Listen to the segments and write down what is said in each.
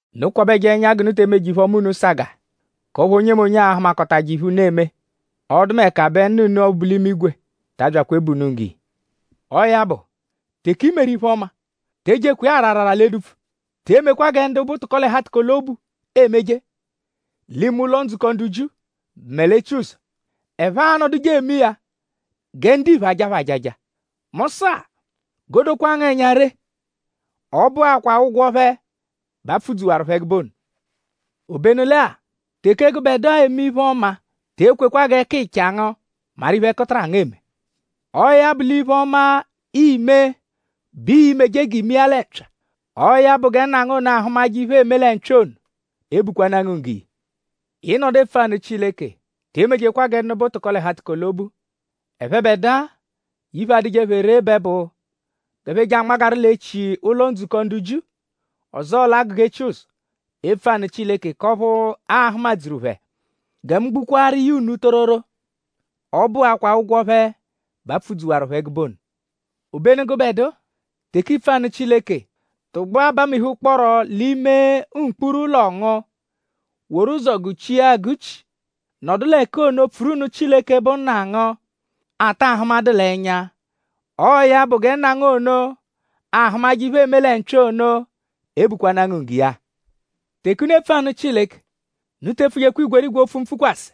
“Unu kwabẹje ẹnya g'unu te emeje iphe-ọma unu sagaa k'ọphu onyemonye a-hụmakotaje iphe unu eme. Ọdumeka bẹ Nna unu ọphu bu l'imigwe ta abyakwa ebu unu nggo iya. “Ọo ya bụ; teke i meru iphe-ọma; te ejekwa iya ara arara l'edupfu. Te emekwa gẹ ndu bụ tụko-l'ẹhu-atụko-l'obu emeje l'ime ụlo-ndzukọ ndu Jiu mẹ l'etsuzọ. Ẹphe anọduje eme iya gẹ ndiphe ajaa phẹ ajaja. Mu sụ-a; g'o dokwaa ngu ẹnya ree; ọ bụakwaa ụgwo phẹ bẹ a pfụ-dzuwaru phẹ ẹgube ono. Obenu lẹ-a; teke gụbedua eme iphe-ọma; te ekwekwa g'ẹkicha ngu maru iphe ẹkutara ngu eme. Ọo ya bụ l'iphe-ọma, iime bẹ ii-meje g'iime iya lẹ mpya. Ọo ya bụ gẹ Nna ngu ono, ahụmaje iphe, eeme lẹ mpya ono ebukwanaa ngu nggo iya.” “Ị -nọdu epfu anụ Chileke; te emejekwa gẹ ndu bụ tụko-l'ẹhu-atụko-l'obu. Ẹphebedua iphe, adụje phẹ ree bẹ bụ g'ẹphe je anmagaru l'echi ụlo-ndzukọ ndu Jiu; ọzoo l'agụga etsuzọ epfu anụ Chileke; k'ọphu aa-hụmadzuru phẹ. Gẹ mu gbukwaaru iya unu tororo; ọ bụakwaa ụgwo phẹ bẹ a pfụ-dzuwaru phẹ ẹgube ono. Obenu gụbedua; teke iipfu anụ Chileke; tụgbua bamihukpọoro l'ime mkpuru ụlo ngu woru ụzo gụ-chia agụ-chi; nọdu l'ẹka ono pfuru nụ Chileke, bụ Nna ngu, a ta ahụmadu l'ẹnya. Ọo ya bụ gẹ Nna ngu ono, ahụmaje iphe, eeme lẹ mpya ono ebukwanaa ngu nggo iya. “Teke unu epfu anụ Chileke; unu te epfujekwa igwerigwe opfu mpfụkwase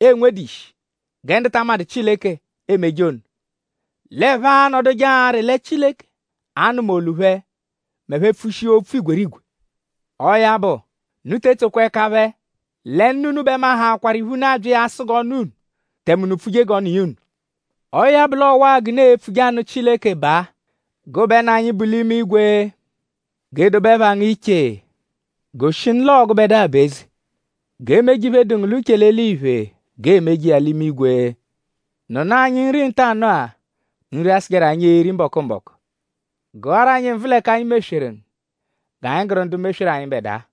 'enwedu ishi gẹ ndu ta amadụ Chileke emeje ono. L'ẹphe anọduje arị lẹ Chileke a-nụma olu phẹ m'ẹphe -pfushia opfu igwerigwe. Ọo ya bụ; unu te etsokwa ẹka phẹ. Lẹ nna unu bẹ mahaakwaru iphe, unu abya iya asụ g'ọ nụ unu; tẹme unu pfuje g'ọ nụ iya unu. Ọo ya bụ l'ọwa-a g'unu e-pfuje anụ Chileke baa: “ ‘Gụbe Nna anyi, bu l'imigwe. G'e dobe ẹpha ngu iche; Goshinu l'oo gụbedua bụ eze. G'e meje iphe, dụ ngu l'uche l'eliphe g'eemeje iya l'imigwe. Nụnu anyi nri ntanụ-a; Nri, a-sụjeru anyi eri mbọku-mbọku. Gụaru anyi nvụ l'ẹka anyi mesweru ngu; G'anyi gụru ndu mesweru anyịbedua.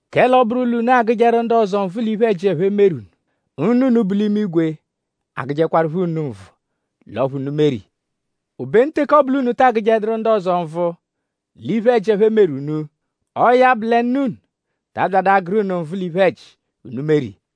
“Kẹle ọ -bụru l'unu agụjeru ndu ọzo nvụ l'iphe-ẹji, ẹphe meru unu; Nna unu, bu l'imigwe a-gụjekwarupho unu nvụ l'ọphu unu meru iya. Obenu teke ọ bụ l'unu ta agụjeduru ndu ọzo nvụ l'iphe-ẹji, ẹphe meru unu; ọo ya bụ lẹ Nna unu ta abyadụ agụru unu nvụ l'iphe-ẹji, unu meru iya.”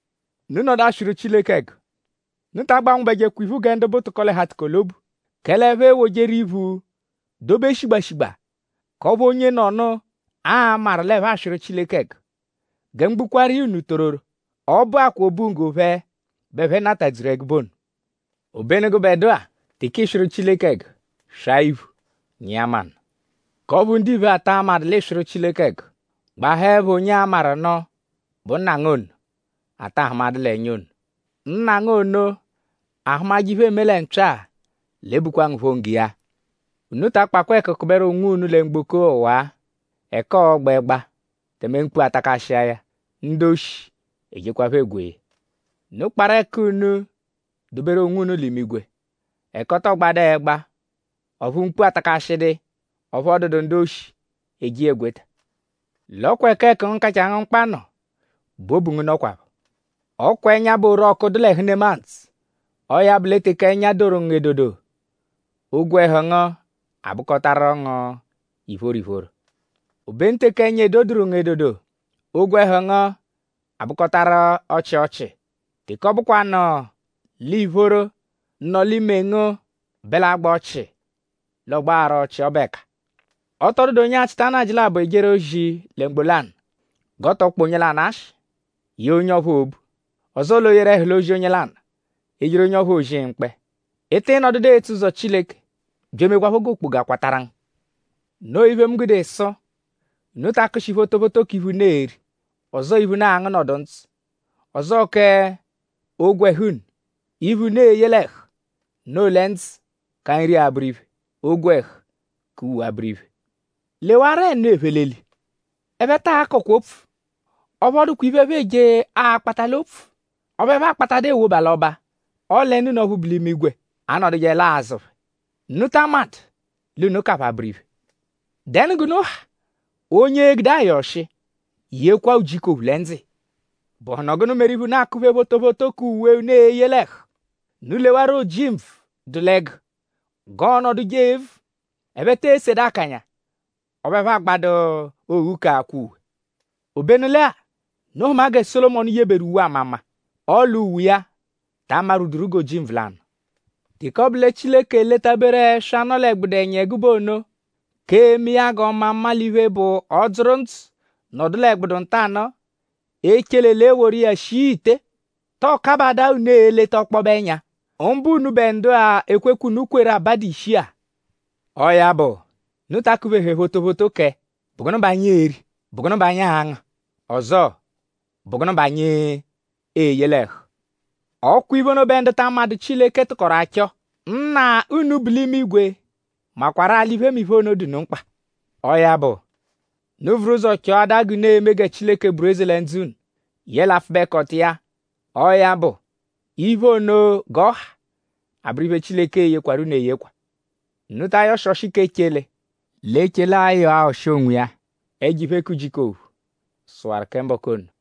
“Unu -nọdu aswịru Chileke ẹgu; unu ta agbanwụbejekwa iphu gẹ ndu bụ tụko-l'ẹhu-atụko-l'obu. Kẹle ẹphe ewojeru iphu dobe shigba shigba; k'ọphu onyenọnu a-maru l'ẹphe aswịru Chileke ẹgu. Gẹ mu gbukwaaru iya unu tororo; ọ bụakwaa obunggo phẹ bẹ ẹphe natadzuru ẹgube ono. Obenu gụbedua; teke ịiswiru Chileke ẹgu; swaa iphu; nyịa manụ; k'ọphu ndiphe ata amadụ l'ịiswiru Chileke ẹgu. Gbahaẹpho onye a-maru nụ bụ Nna ngu ono, a ta ahụmadu l'ẹnya ono. Nna ngu ono, ahụmaje iphe, eeme lẹ mpya-a l'e-bukwa ngu phọ nggo iya.” “Unu ta akpakwa ẹku kụberu onwunu lẹ mgboko ọwa-a; ẹka ọo-gba ẹgba; tẹme mkpu atakashia ya; ndu-oshi ejekwaphọ egwee ya. Unu kparụ ẹku unu doberu onwunu l'imigwe; ẹka ọ tọo gbadu ẹgba; ọphu mkpu atakashịdu iya; ọphu ọ dụdu ndu-oshi eje iya egweta. L'ọ kwa ẹka ẹku ngu, kachaa ngu mkpa nọ bẹ obu ngu nọkwapho.” “Ọ kwa ẹnya bụ orọku, dụ l'ẹhu nemadzụ. Ọo ya bụ lẹ teke ẹnya doru ngu edodo; ogwẹhu ngu abụkotaru ngu ìphóró ìphóró. Obenu teke ẹnya edoduru ngu edodo; ogwẹhu ngu abụkotaru ọchii ọchii. Teke ọ bụkwanu l'ìphóró, nọ l'ime ngu bẹ l'agba ọchii; l'ọ gbagharu ọchii ọbu ẹka.” “Ọ tọ dụdu onye achịta nnajị labọ ejeru ozi lẹ mgbo lanụ g'ọ tọ kpọ onye lanụ ashị; yee onye ọphuu obu; ọzoo l'o yeru ẹhu l'ozi onye lanụ; ejeru onye ọphuu ozi mkpẹ. Ị tịi nọdudu etso ụzo Chileke bya emekwaphọ g'okpoga kwatarụ ngu. “Noo iphe, mu gude sụ; unu ta akụshi photophoto k'iphe, unu e-ri; ọzoo iphe, unu a-ngụ nọdu ndzụ. Ọzoo k'ogwẹhu unu; iphe, unu e-ye l'ẹhu. Noo lẹ ndzụ ka nri abụru iphe; ogwẹhu ka uwe abụru iphe. Lewarọ ẹnu, ephe l'eli. Ẹphe ta akọkwa opfu; ọphu ọ dụkwa iphe, ẹphe eje akpata l'opfu; ọphu ẹphe akpatadu ewoba l'ọba; ọle Nna unu ọphu bu l'imigwe anọdujeelaa azụ phẹ.?Unu ta amadụ l'unu ka phẹ abụru iphe. ?Dẹnu g'unu ha onye e-gude ayọ ọshi yekwa ujiku ophu lẹ ndzụ iya? “?Bụhunu gụnu meru iphe, unu akụ-phe photophoto k'uwe, unu e-ye l'ẹhu? Unu lewarọ ojimbvu, dụ l'ẹgu g'ọonoduje evu. Ẹphe te esedu akanya; ọphu ẹphe agbadu oghu k'akwa uwe. Obenu lẹ-a; unu hụma gẹ Sólomọnu yeberu uwe ama mma; ọle uwe iya ta amarwuduru g'ojimbvu lanụ. Teke ọbu lẹ Chileke eletaberu ẹswa, nọ l'ẹgbudu ẹnya ẹgube ono: k'eme iya g'ọ ma mma; l'iphe, bụ ọ -dzụru ndzụ nọdu l'ẹgbudu ntanụ-a; echele l'e woru iya shia ite.?Tọo kabadaa unu eleta ọkpobe ẹnya? mbụ unubẹ ndu-a, ekwekwe, unu kweru abadu ishi-a! Ọo ya bụ; unu ta akụ-phehẹ photophoto kẹ ‘?Bụ gụnu bẹ anyi e-ri?’ ‘?Bụ gụnu bẹ anyi a-ngụ?’ Ọzoo ‘?Bụ gụnu bẹ anyi e-ye l'ẹhu?’ Ọ kwa iphe ono bẹ ndu amadụ Chileke tụkoru achọ. Nna unu, bu l'imigwe makwarụ-a l'iphemiphe ono dụ unu mkpa. Ọo ya bụ; unu vuru ụzo chọadaa g'unu e-me gẹ Chileke bụru eze lẹ ndzụ unu; yẹle apfụbekoto iya; ọo ya bụ; iphe ono g'ọ ha abụru iphe, Chileke e-yekwarụ unu eyekwa. Unu ta ayọshi ọshi k'echele; l'echele a-yọ-a ọshi onwiya. Ẹjo iphe k'ujiku ophu sụwaru kẹ mbọku ono.”